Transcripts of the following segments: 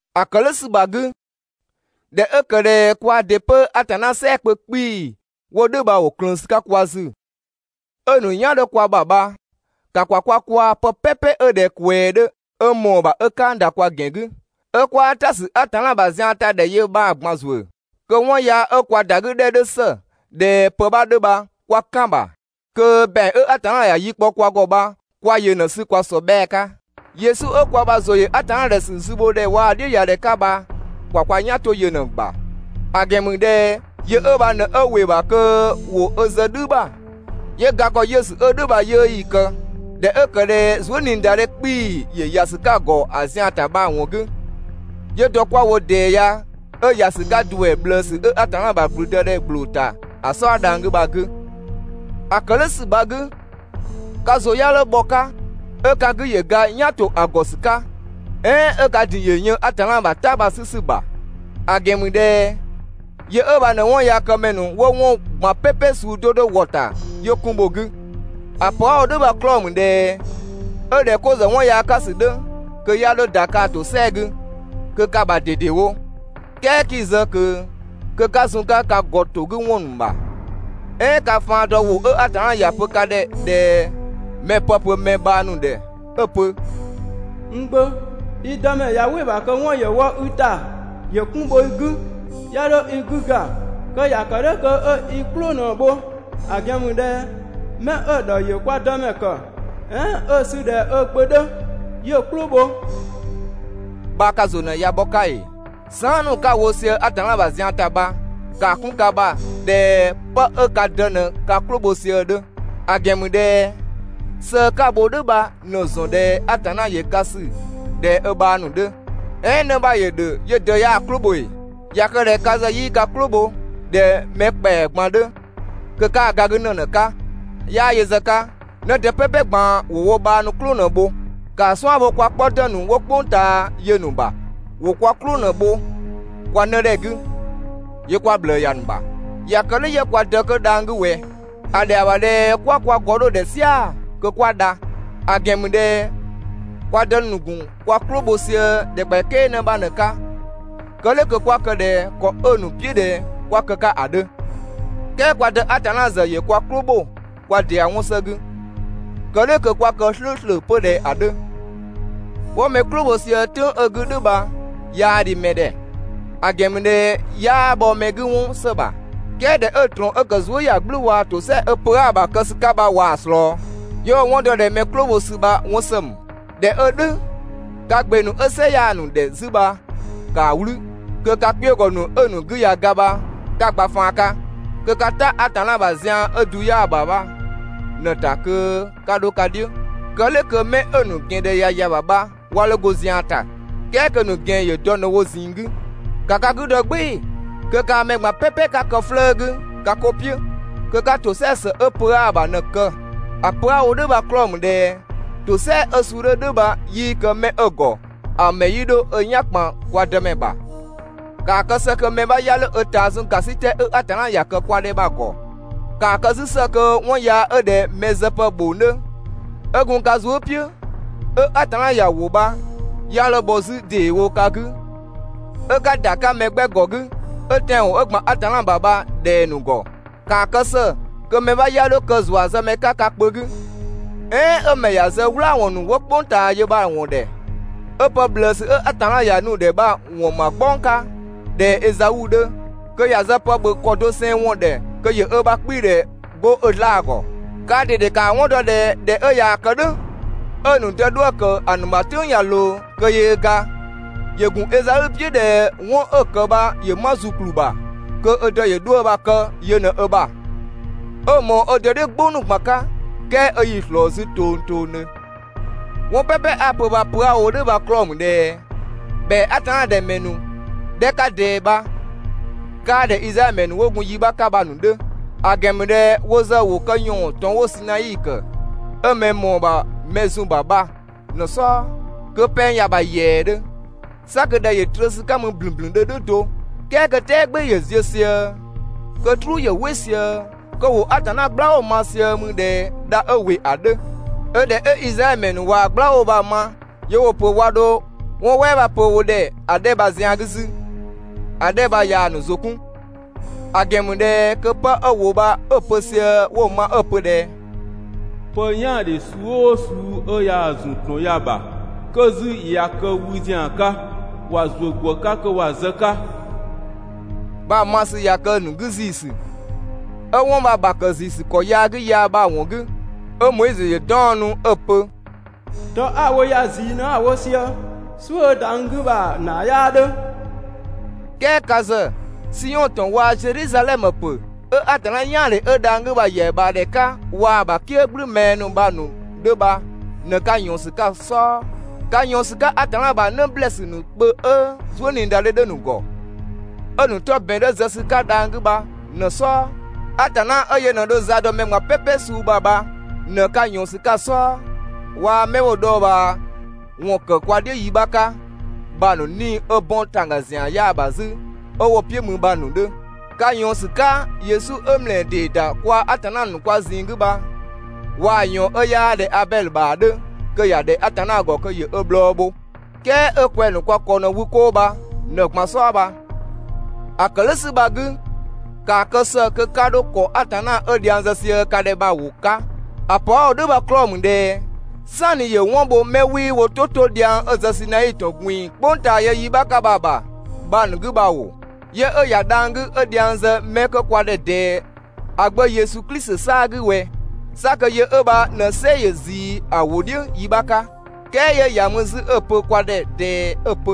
‑A ‑kë "dhʋ̈ ‑sü bha‑ 'gü, ꞊dhɛ 'ö ‑kë ꞊dhɛ kwaa ‑dɩ 'pö Atanna "sɛɛ‑ kpö 'kpii‑ 'wo "dhʋ̈ bha ‑wo ꞊klëën ‑sü 'ka kwa ‑zü, 'ö‑ ‑nu "yan 'dhö kwa ‑bha bha, ‑ka ‑kwa kwa kwaa‑ pë "pɛpɛ 'ö ꞊dhɛ ꞊kwɛɛ 'dhö 'ö ꞊mɔɔ‑ ‑bha 'ö "kang ‑da kwa ‑gɛn 'gü, 'ö 'kwaa "ta ‑sü Atanna ‑bha zian bha‑ ‑ta ‑dhɛ yö bha‑ ꞊gban ‑zuö, kö 'wɔn yaa 'ö kwa ‑da 'gü ‑dhɛ 'dhö ‑së ꞊dhɛ 'pë 'bha 'dhö bha 'kwa "kan‑ ‑bha, kö ‑bɛang 'ö Atanna ‑ya yi kpɔ kwa ‑gɔ bha 'kwa yö ꞊në‑ 'sü kwa ‑sɔbhɛɛ 'ka. Yesu ö kwa ‑bha ‑zʋ ‑yö Atanna ‑dhɛ ‑sü zübhodhɛ waa‑ "dhiʋ̈yadhɛ 'ka bha ‑ka ‑kwa kwa "yan 'to yö ꞊në‑ ‑bha. ‑A ‑gɛn ‑mü ꞊dhɛ yö 'ö bha ꞊në 'ö ‑wɩ ‑bha kö ‑wo ö zë "dhü ‑bha, 'yö ga ‑kɔ 'yiʋ̈sü 'ö‑ suu 'dhö "dhʋ̈ bha‑ 'yiʋ̈‑ 'yii‑ kë, ꞊dhɛ 'ö ‑kë ꞊dhɛ zuëniidadhe 'kpii‑ ‑yö ‑ya ‑sü 'ka‑ ‑gɔ ‑a zian‑ ‑ta bha‑ ‑wɔn 'gü, 'yö dɔ 'kwa‑ wo ꞊dɛɛ ya 'ö ‑ya ‑sü 'ka ‑duɛ ꞊bhlëësü 'ö Atanna ‑bha ‑blüdëdhɛ ‑gbloo ‑ta ‑a "sɔɔ dhang‑ 'gü bha‑ 'gü. ‑A ‑kë "dhʋ̈ ‑sü bha‑ 'gü, ka ‑zʋ 'ya 'dho bhɔ‑ 'ka, 'ö ka 'gü ‑yö ga "yan ‑to ‑a ‑gɔ ‑sü 'ka, "ɛɛn 'ö ka ‑din ‑yö yën Atanna ‑bha "ta bha‑ 'sü ‑sü ‑bha. ‑A ‑gɛn ‑mü ꞊dhɛ yö 'ö bha ꞊në 'wɔnyaakëmɛ ‑nu 'wo 'wɔn ꞊gban "pɛpɛ suu 'do 'do ‑wɔ ‑ta 'yö 'kun bho‑ 'gü. ‑A pö 'a‑ wo "dhʋ̈ bha‑ 'klɔɔ‑ ‑mü ꞊dhɛ, 'ö ꞊dhɛ 'ko ‑zë 'wɔn yaa 'ka ‑sü 'dhö kö 'ya 'dho ‑da kaa‑ ‑tosɛa 'gü, kö ka‑ ‑bha ꞊dedewo, "kɛɛ 'kii‑ zë ꞊kö kö 'ka zun‑ 'ka ka ‑gɔ ‑to 'gü ‑wɔn ‑nu ‑bha. "Ɛɛn ka faan dɔ ‑wʋ 'ö Atanna ‑ya pö ka ‑dhɛ ꞊dhɛ mɛ‑ pë pö mɛ bhang ‑nu ‑dhɛ 'ö‑ pö: «N gbö, i Dëmɛ ꞊ya "wɩ‑ ‑bha kö 'wɔn ‑yö wɔ i ‑ta ‑yö 'kun bho i 'gü, 'ya 'dho i 'gü ga, kö ‑ya ‑kë "dhʋ̈ kö 'ö i "klʋ ꞊në‑ bho, ‑A ‑gɛn ‑mü ꞊dhɛ 'mɛ 'ö‑ ‑dhɔ ‑yö kwa Dëmɛ ‑kë, "ɛɛn 'ö‑ sü ꞊dhɛ ö gbö 'dhö 'yö‑ "klʋ bho» bha ka ‑zʋ ꞊në ꞊ya bhɔ‑ 'ka ‑ee? Saan" ‑nu 'ka‑ wo sië Atanna ‑bha zian ‑ta bha, ‑kaa 'kun ka ‑bha ꞊dhɛ 'pë 'ö ka dë ꞊në ka "klʋ bho sië‑ 'dhö. ‑A ‑gɛn ‑mü ꞊dhɛ sëë 'ka‑ bho "dhʋ̈ bha ꞊në‑ ‑zɔn ꞊dhɛ Atanna ‑yö ka ‑sü ꞊dhɛ ö bhang ‑nu 'dhö. "Ɛɛn 'në 'bha ‑yö ‑dhö 'yö‑ dë 'yaa‑ "klʋ bho ‑ee? ꞊Ya kë ꞊dhɛ ka ‑zë 'yii ka "klʋ bho ꞊dhɛ mɛ ‑kpɛa ꞊gban 'dhö, kö 'kaa‑ ga 'gü ‑në ꞊në‑ 'ka. 'Yaa yö ‑zë 'ka, 'në dë "pɛpɛ ꞊gban ‑wo wo bhang ‑nu "klʋ ꞊në‑ bho. ‑Kaa 'suan‑ bho kwa 'kpɔ ‑dë ‑nu 'wo "kpʋng ꞊taa ya‑ ‑nu ‑bha. ‑Wo kwa "klʋ ꞊në‑ bho kwa 'nëdhɛ 'gü 'yö 'kwa ꞊bhlëë ‑ya ‑nu ‑bha. ꞊Ya kë "dhʋ̈ 'yö kwa Dë 'kö dhang‑ 'gü ꞊wɛ? ‑A ‑dhɛa ‑bha ꞊dhɛ 'kwa kwa ‑gɔ 'dho‑ ‑dhɛ "sia‑ kö 'kwa dha. ‑A ‑gɛn ‑mü ꞊dhɛ kwa dë ‑nu ‑gun kwa "klʋ bho sië ‑dhɛkpaɔyi "kɛɛ 'në 'bha ꞊në‑ 'ka, kë "dhʋ̈ kö 'kwa kë ꞊dhɛ ‑kɔ 'ö‑ ‑nu "piʋ̈ ꞊dhɛ 'kwa kë‑ 'ka ‑a 'dhö, "kɛɛ kwa Dë Atanna ‑zë ‑yö kwa "klʋ ‑bho kwa ‑dɩa 'wɔn ‑së 'gü, kë "dhʋ̈ kö 'kwa kë "slʋ̈ʋ̈slʋ̈ 'pö ꞊dhɛ ‑a 'dhö. 'Wo mɛ "klʋ bho sië "tʋ̈ng 'ö‑ 'gü "dhʋ̈ bha 'yaa dhi mɛ ‑dhɛ, ‑a ‑gɛn ‑mü ꞊dhɛ 'yaa bhɔ mɛ 'gü 'wɔn ‑së ‑bha. "Kɛɛ ꞊dhɛ 'ö‑ ꞊trɔɔn 'ö ‑kë zuëyagblʋ̈ʋ̈‑ waa‑ ‑tosɛa 'ö pö 'aa‑ ‑bha ‑a kë ‑sü 'ka bha ꞊waa‑ ꞊slɔɔ, 'yö 'wo‑ 'wɔn dɔ ꞊dhɛ mɛ "klʋ bho ‑sü bha 'wɔn ‑së ‑mü. ꞊Dhɛ 'ö "dhʋ̈, ka ‑gbe ‑nu 'ö "sɩ 'yaa ‑nu ‑dhɛ 'zü bha ‑kaa "wlü, kö ka kpiögɔ ‑nu 'ö‑ ‑nu 'gü ꞊ya ga bha 'ka‑ gba faan 'ka. Kö 'ka "ta Atanna ‑bha ‑zian 'ö‑ du 'yaa‑ ‑bha bha ꞊në‑ ‑ta kö 'ka 'dho‑ 'ka "dhiʋ̈, kë "dhʋ̈ kö 'mɛ 'ö‑ ‑nu ‑gɛn ‑dhɛ ꞊ya ‑ya ‑bha bha 'wa 'dho 'go zian ‑ta, "kɛɛ kö‑ ‑nu ‑gɛn ‑yö dɔ ꞊në‑ wo ꞊zinng 'gü. ‑Ka ka 'gü dɔ "gbɩɩ‑ kö kaa mɛ ꞊gban "pɛpɛ ka kë 'flëë‑ 'gü ka 'ko "piʋ̈, kö 'ka ‑tosɛa ‑së 'ö pö 'aa‑ ‑bha ꞊në‑ kë. ‑A pö 'a‑ wo "dhʋ̈ bha‑ 'klɔɔ‑ ‑mü ꞊dhɛ ‑tosɛa 'ö suu 'dhö "dhʋ̈ bha 'yii kë mɛ 'ö‑ ‑gɔ, ‑a ‑mɛ 'yii 'dho ö "yan ‑kpan kwa Dëmɛ ‑bha. ‑Kaa kë ‑së kö mɛ 'bha 'ya 'dho ö ꞊taa zun ‑gasitɛ 'ö Atanna ‑ya ‑kë kwa ‑dhɛ bha‑ ‑gɔ. ‑Kaa kë 'zü ‑së kö 'wɔn yaa 'ö ꞊dhɛ mɛ zëpë ‑bhong 'dhö 'ö gun ka zuë" "piʋ̈, 'ö Atanna ꞊yaa‑ ‑wo bha 'ya 'dho bhɔ 'zü ‑deewo ka 'gü 'ö 'ka ‑da 'ka mɛ 'gbɛ ‑gɔ 'gü 'ö tɛanwɔn 'ö ‑gban Atanna ‑bha bha‑ ꞊dhɛng‑ ‑nu ‑gɔ. ‑Kaa kë ‑së kö mɛ 'bha 'ya 'dho kë ‑zuazëmɛ 'ka ka kpö 'gü, "ɛɛn 'ö‑ ‑mɛ ‑ya zë "wlaawɔn ‑nu 'wo "kpʋng ꞊taa yö bha‑ ‑wɔn ‑dhɛ, 'ö pë ꞊bhlëësü 'ö Atanna ‑ya nu‑ ‑dhɛ bha‑ ‑wɔn ‑ma "gbɔng 'ka ꞊dhɛ Ezau 'dhö, kö ‑ya zë pë ‑bhö ‑kɔ doseng ‑wɔn ‑dhɛ kö ‑yö ö ‑bha 'kpiidhɛ 'go ö 'zlaa‑ ‑gɔ. Kaa ꞊dede ka‑ 'wɔn ‑dɔ ꞊dhɛ ꞊dhɛ 'ö ꞊yaa‑ kë "dhʋ̈, 'ö‑ ‑nu dë 'dhuë‑ ‑kë ‑a ‑nu ‑bha "tʋ̈ng ꞊ya ꞊loo kö yöö ga, ‑yö ‑gun Ezau "piʋ̈ ꞊dhɛ 'wɔn 'ö‑ ‑kë bha ‑yö 'ma ‑zukplü ‑bha kö ö dë ‑yö 'dhuë‑ bha‑ kë yö ꞊në ö ‑bha, 'ö‑ ꞊mɔɔ ö dë "dhiʋ̈ "gbʋ ‑nu ꞊gban 'ka, "kɛɛ 'ö 'yii‑ ꞊slɔɔ 'zü tongtongdhö. 'Wɔn "pɛpɛ 'a‑ pö bha‑ pö 'a‑ wo "dhʋ̈ bha‑ 'klɔɔ‑ ‑mü ꞊dhɛ ‑bhɛa Atanna ‑dhɛ ‑mɛ ‑nu 'dhɛ 'ka ꞊dɛɛ bha 'kaa ꞊dhɛ Izraɛdhö ‑mɛ ‑nu 'wo gun yi 'bha 'ka bha‑ ‑nu 'dhö. ‑A ‑gɛn ‑mü ꞊dhɛ wo ‑zë ‑wo kë ‑yɔɔn ‑tɔn 'wo‑ Sinai ‑kë, 'ö mɛ‑ ꞊mɔɔ ‑bha mɛ‑ zun‑ ‑bha bha ꞊në‑ "sɔɔ, kö pɛng ‑ya ‑bha ‑yɛɛdhö, 'sa kö ‑dhɛ ‑yö trö ‑sü 'ka mü ‑blünblündhö "dhʋ̈ do, "kɛɛ kö "tɛɛ "gbɩɩ‑ ‑yö ziö sië, kö "truu ‑yö "wɩ sië, kö ‑wo Atanna "gblawʋ ma sië mü ꞊dhɛ dha 'ö ‑wɩ ‑a 'dhö, 'ö ꞊dhɛ 'ö Izraɛdhö ‑mɛ ‑nu ꞊wa mɛ "gblawʋ bha‑ ma 'yö 'wo‑ pö 'wa 'dho 'wɔn "wɛɛ 'bha pö wo ‑dhɛ ‑a 'dhɛ bha‑ zian 'gü 'zü, ‑a 'dhɛ bha ꞊yaa‑ ‑nu ‑zʋ 'kun. ‑A ‑gɛn ‑mü ꞊dhɛ kö 'pë 'ö ‑wʋ bha 'ö‑ pö sië 'wo‑ ma 'ö‑ pö ꞊dhɛ: «Pë "yaandhe suu "ʋʋ suu 'ö yaa‑ ‑zun ‑tɔn ya‑ ‑bha, kö 'zü ꞊ya kë wü ‑zian 'ka, ‑wa ‑zuö ‑gwë 'ka kö ‑wa zë‑ 'ka» bha‑ ma ‑sü ꞊ya kë‑ ‑nu 'gü ‑ziisü. 'Ö 'wɔn bha‑ ‑bha ‑kë ‑ziisü ‑kɔ yaa 'gü yaa bha‑ ‑wɔn 'gü, 'ö Moizö ‑yö 'daɔnnu 'ö‑ pö: «Dɔ 'a‑ wo ya ꞊zii ꞊në 'a‑ wo sië, "suʋ̈ 'ö ‑da n 'gü bha‑ ‑naa 'yaa 'dhö!» "Kɛɛ ka ‑zë, Siɔn ‑tɔn waa‑ Zedhizadhɛmö ‑pö 'ö Atanna "yaandhe 'ö dhang‑ 'gü bha‑ ‑yɛa ꞊bhaa ‑dhɛ 'ka, waa‑ ‑a ‑bha "kië "gblü mɛɛ ‑nu bha‑ ‑nu 'dhö bha ꞊në 'ka ꞊yɔɔn ‑sü 'ka‑ "sɔɔ. Ka ꞊yɔɔn ‑sü 'ka Atanna ‑bha 'në ‑blɛɛsü ‑nu kpö 'ö zuëniidadhe 'dhö‑ ‑nu ‑gɔ, 'ö‑ ‑nu 'tɔ ‑bɛn 'dhö zë ‑sü 'ka dhang‑ 'gü bha ꞊në‑ "sɔɔ. Atanna 'ö yö ꞊në dho za dɔ mɛ ꞊gban "pɛpɛ suu ‑bha bha ꞊në 'ka ꞊yɔɔn ‑sü 'ka‑ "sɔɔ. Waa‑ 'mɛ 'wo‑ dhɔɔbhaawɔn ‑kë kwa "dhiʋ̈ yi 'bha 'ka bha‑ ‑nu 'nii‑ 'ö 'bɔn ‑tangga ‑zian 'yaa‑ ‑bha 'zü 'ö 'wo‑ "piʋ̈ mü bha‑ ‑nu 'dhö. Ka ꞊yɔɔn ‑sü 'ka Yesu 'ö ‑mlɛɛ ‑dee ‑da kwaa‑ Atanna ‑nu kwa ꞊zinng 'gü bha, waa‑ ꞊yɔɔn 'ö 'yaa ꞊dhɛ Abɛdhö ‑bha 'dhö kö ‑ya ‑dhɛ Atanna ‑gɔ kö ‑yö ö bhlɔɔ bho, "kɛɛ 'ö kwɛng‑ ‑nu kwa ‑kɔ ꞊në wü 'koo bha ꞊në‑ ꞊gban "sɔɔ bha. ‑A ‑kë "dhʋ̈ ‑sü bha‑ 'gü, ‑kaa kë ‑së kö 'ka 'dho ‑kɔ Atanna 'ö dhiang zë sië ka ‑dhɛ bha‑ ‑wʋ 'ka. ‑A pö 'a‑ wo "dhʋ̈ bha‑ 'klɔɔ‑ ‑mü ꞊dhɛ "sanni ‑yö 'wɔn bho 'mɛ 'wii wo "tʋ 'to dhiang 'ö‑ zë Sinai ‑tɔn ꞊gbin‑ "kpʋng ꞊taa yö yi 'bha 'ka bha‑ ‑bha bha‑ ‑nu 'gü bha ‑oo, 'yö 'ö ‑ya dhang‑ 'gü 'ö dhiang zë 'mɛ 'kö kwa ‑dhɛ ꞊dɛɛ ‑a Gbö Yesu Klisi 'saa‑ 'gü ꞊wɛ? 'Sa kö yö 'ö bha ꞊në "sɛ ‑yö ꞊zii ‑a ‑wʋ "dhiʋ̈ yi 'bha 'ka, "kɛɛ 'yö ‑ya mü 'zü 'ö‑ pö kwa ‑dhɛ ꞊dɛɛ 'ö‑ pö: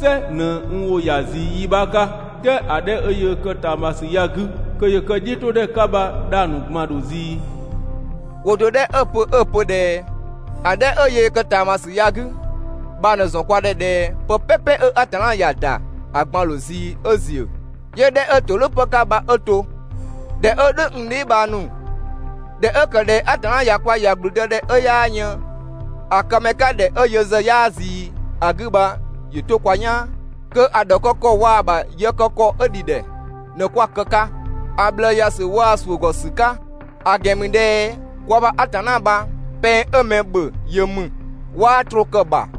«"Sɛ ꞊në n ‑wʋ ‑ya ꞊zii yi 'bha 'ka, "kɛɛ ‑a 'dhɛ 'kö yöö kë ꞊taamasü ya‑ 'gü kö ‑yö kë‑ "dhiʋ̈todhɛ 'ka bha dhang‑ ‑nu ꞊gban ‑dho ꞊zii!» ‑Wʋ do 'dhɛ 'ö‑ pö 'ö‑ pö ꞊dhɛ: «‑A 'dhɛ 'ö yöö kë ꞊taamasü ya‑ 'gü,» bha ꞊në‑ ‑zɔn kwa ‑dhɛ ꞊dhɛ pë "pɛpɛ 'ö Atanna ‑ya ‑da ‑a ꞊gban‑ ‑dho ꞊zii 'ö ‑ziö, 'yö‑ 'dhɛ 'ö ‑todhʋ̈ ‑pë 'ka bha 'ö to. ꞊Dhɛ 'ö "dhʋ̈, n dheebhang ‑nu, ꞊dhɛ 'ö ‑kë ꞊dhɛ Atanna ꞊ya kwa ‑ya ‑gblüdëdhɛ 'ö 'yaa yën ‑a këmɛ 'ka ‑dhɛ 'ö yö ‑zë 'yaa ꞊zii ‑a 'gü bha ‑yö 'to kwa "yaan, kö‑ ‑dhɔkë ‑kɔ waa‑ ‑bha yë kë ‑kɔ 'ö ‑dhi ‑dhɛ ꞊në 'kwa‑ kë‑ 'ka, ‑a ꞊bhlëë ‑ya ‑sü waa‑ ‑suʋ̈ ‑gɔ ‑sü 'ka. ‑A ‑gɛn ‑mü ꞊dhɛ kwa ‑bha Atanna bha pɛng 'ö mɛ ‑bhö yö ‑mü, 'waa troo kë‑ ‑bha.